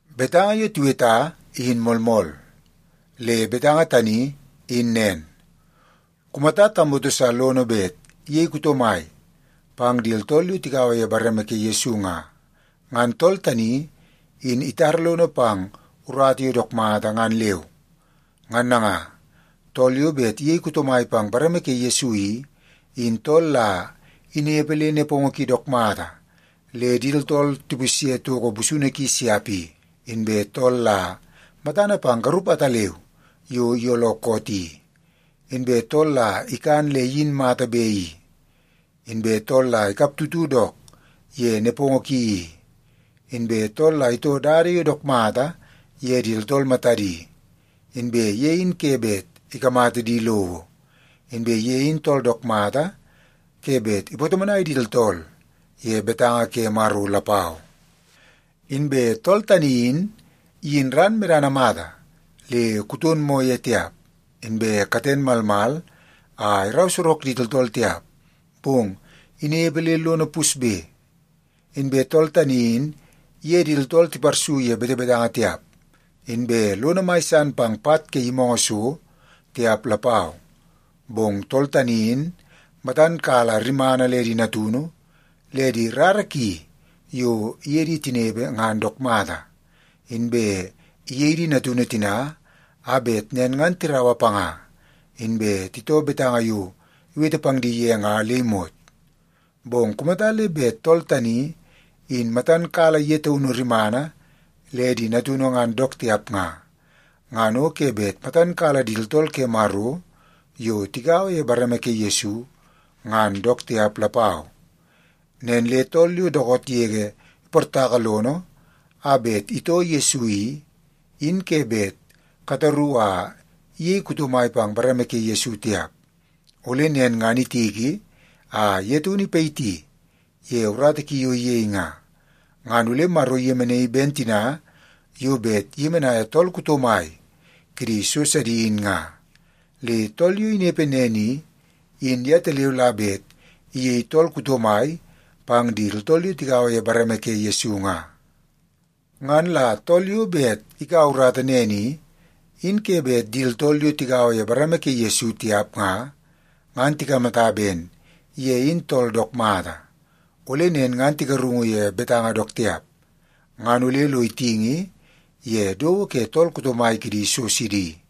Betanga yo tiweta in moolmool. Le betanga tani in nen, kumata tamoto sa lono bet iyei tool kuto mai pang di tooltool yo tigaua ye bareme ke Yesu nga, ngan tool tani in itara lono pang urata yo dook mata ngan leu. Ngan nanga, tool yo bet iyei kuto mai pang bareme ke Yesu i, in tool la inepe le nepongo ki dook mata le di tooltool tipusye toko busunu ki siap i, inbe tool la matana pang garup ataleu yo iyooloo koot i, inbe tool la ikan le iyin mata be i, inbe tool la ikaptutu dook ye nepongo ki i, inbe tool la itoo dada yo dook mata ye di tooltool matadi, inbe ye in ke bet ikamata di lowo, inbe ye in tool dook mata ke bet ipatomonai di tooltool ye betanga ke Maro lapau. Inbe tool tani in iyin ran medana mata le kuton moo ye tiap, inbe katen malmal a irau sorok di tooltool tiap, bong inepe le lono pusbe. Inbe tool tani in iye di tooltool tiparsu ye betebetanga tiap, inbe lono mai san pang pat ke yimoongoo so tiap lapau. Bong tool tani in matan kala rimana le di natunu le di rara ki yo iye di tinepe ngan dook mata, inbe iyei di natunu tina a bet nen ngan tiraua panga inbe titoo betanga yo iwete pang di ye nga le imot. Bong kumata le bet tool tani in matan kala ye taunu rimana le di natunu ngan dook tiap nga, ngan o ke bet matan kala di tooltool ke Maro yo tigaua ye bareme ke Yesu, ngan dook tiap lapau. Nen le tool yo dookoot yege iportaka lono a bet itoo Yesu i, in ke bet kataru a iyei kuto mai pang bareme ke Yesu tiap. Ole nen ngan itiki a ye taunu ipayiti ye urata ki yo iyei nga, ngan ole Maro iyemenaii ben tina yo bet iyemenaia tool kuto mai kidi so sidi in nga. Le tool yo inepe nen i, in yetaleu la bet iyei tool kuto mai pang di tooltool yo tigaua ye bareme ke Yesu nga. Ngan la tool yo bet ikaua urata nen i, in ke bet di tooltool yo tigaua ye bareme ke Yesu tiap nga, ngan tikamata ben ye in tool dook mata. Ole nen ngan tigarungu ye betanga dook tiap, ngan ole lo itingi ye dowo ke tool kuto mai kidi so sidi.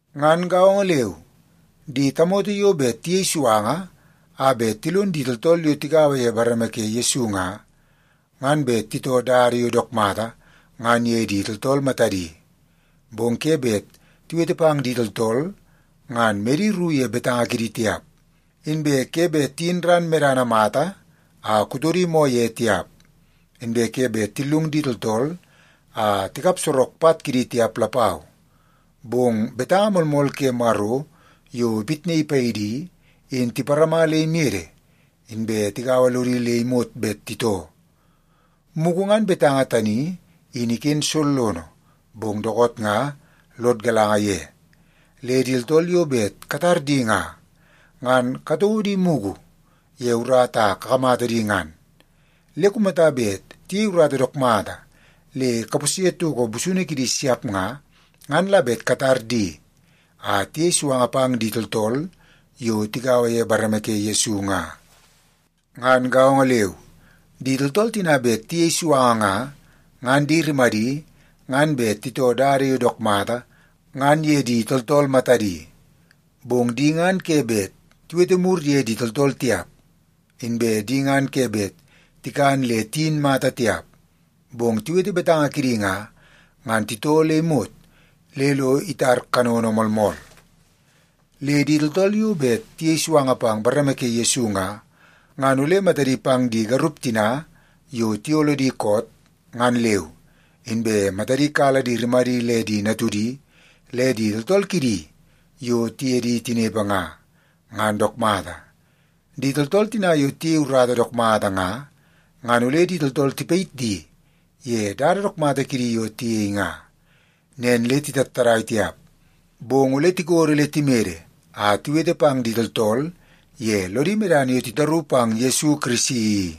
Ngan gaongo leu, di tamoto yo bet tiyei suanga a bet tilon di tooltool yo tigaua ye bareme ke Yesu nga, ngan bet titoo dada yo dook mata ngan ye di tooltool matadi. Bong ke bet tiwete pang di tooltool ngan medi ru ye betanga kidi tiap, inbe ke bet tiyin ran medana mata a kutodi moo ye tiap, inbe ke bet tillung di tooltool a tikap sorok pat kidi tiap lapau. Bong betanga moolmool ke Maro yo ipitnaii paidi i, in tiparama le imede inbe tigaua lodi le imot bet titoo. Mugu ngan betanga tani in iken sollono, bong dookoot nga lod galanga ye. Le di tooltool yo bet katar di nga, ngan katouo di mugu ye urata a kakamata di ngan. Le kumata bet tiyei urata dook mata le kapusye toko busunu kidi siap nga, ngan la bet katar di a tiyei suanga pang di tooltool yo tigaua ye bareme ke Yesu nga. Ngan gaongo leu, di tooltool tina bet tiyei suanga nga, ngan di rimadi ngan bet titoo dada yo dook mata ngan ye di tooltool matadi. Bong di ngan ke bet tiwete mur ye di tooltool tiap, inbe di ngan ke bet tikan le tiyin mata tiap. Bong tiwete betanga kidi nga, ngan titoo le imot le lo itar kanono moolmool. Le di tooltool yo bet tiyei suanga pang bareme ke Yesu nga, ngan ole matadi pang di garup tina yo tiyooloo di koot, ngan leu, inbe matadi kala di rimadi le di natudi le di tooltool kidi yo tiye di tinepe nga, ngan dook mata. Di tooltool tina yo tiyei urata dook mata nga, ngan ole di tooltool tipayit di ye dada dook mata kidi yo tiyei nga. Nen le titattadai tiap, bong ole tikodo le timede a tiwete pang di tooltool ye lodi medana yo titaru pang Yesu Kirisi i.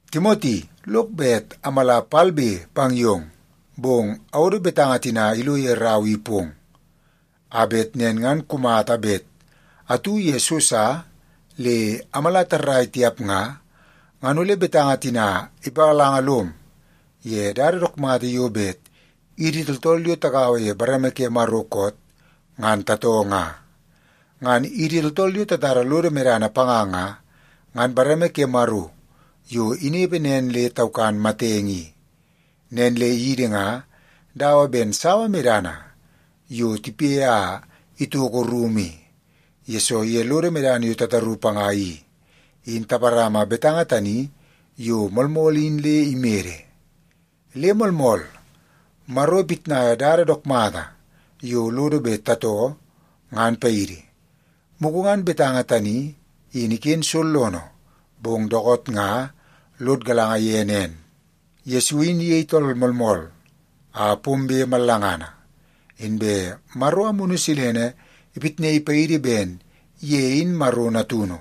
Timoti, lok bet amala palbe pang yong. Bong awodo betanga tina ilo ye rau i pong, a bet nen ngan kumata bet atu ye so sa le amala tarrai tiap nga, ngan ole betanga tina ipagalanga lom ye dada dook mata yo bet idi tooltool yo tagaua ye bareme ke Maro koot, ngan tatoo nga. Ngan idi tooltool yo tatara lodo medana panga nga, ngan bareme ke Maro yo inepe nen le taukan matenge i. Nen le idi nga dawa ben sawa medana yo tipe a itoko rumu i, yesoo ye lodo medana yo tataru panga i, in taparama betanga tani yo moolmool in le imede. Le moolmool, Maro ipitnai dada dook mata yo lono bet tatoo ngan paidi. Mugu ngan betanga tani in iken sollono, bong dookoot nga lod galanga ye nen: Yesu in iyei tool moolmool a pombe mallangana. Inbe Maro Amunu Silene ipitnaii paidi ben ye in Maro natunu.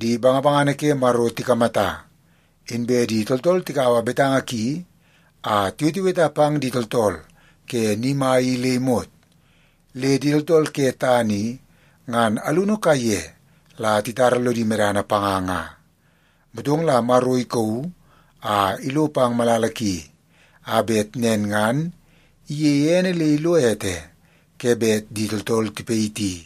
Di bangabangana ke Maro tikamata. Inbe di tooltool tikaua betanga ki a tiweteweta pang di tooltool ke ni mai i le imot. Le di tooltool ke tana i ngan alunu kaiye la titara lodi medana panga nga. Motong la Maro ikauu a ilo pang malala ki, a bet nen ngan iyeie ene le ilo ete ke bet di tooltool tipayiti.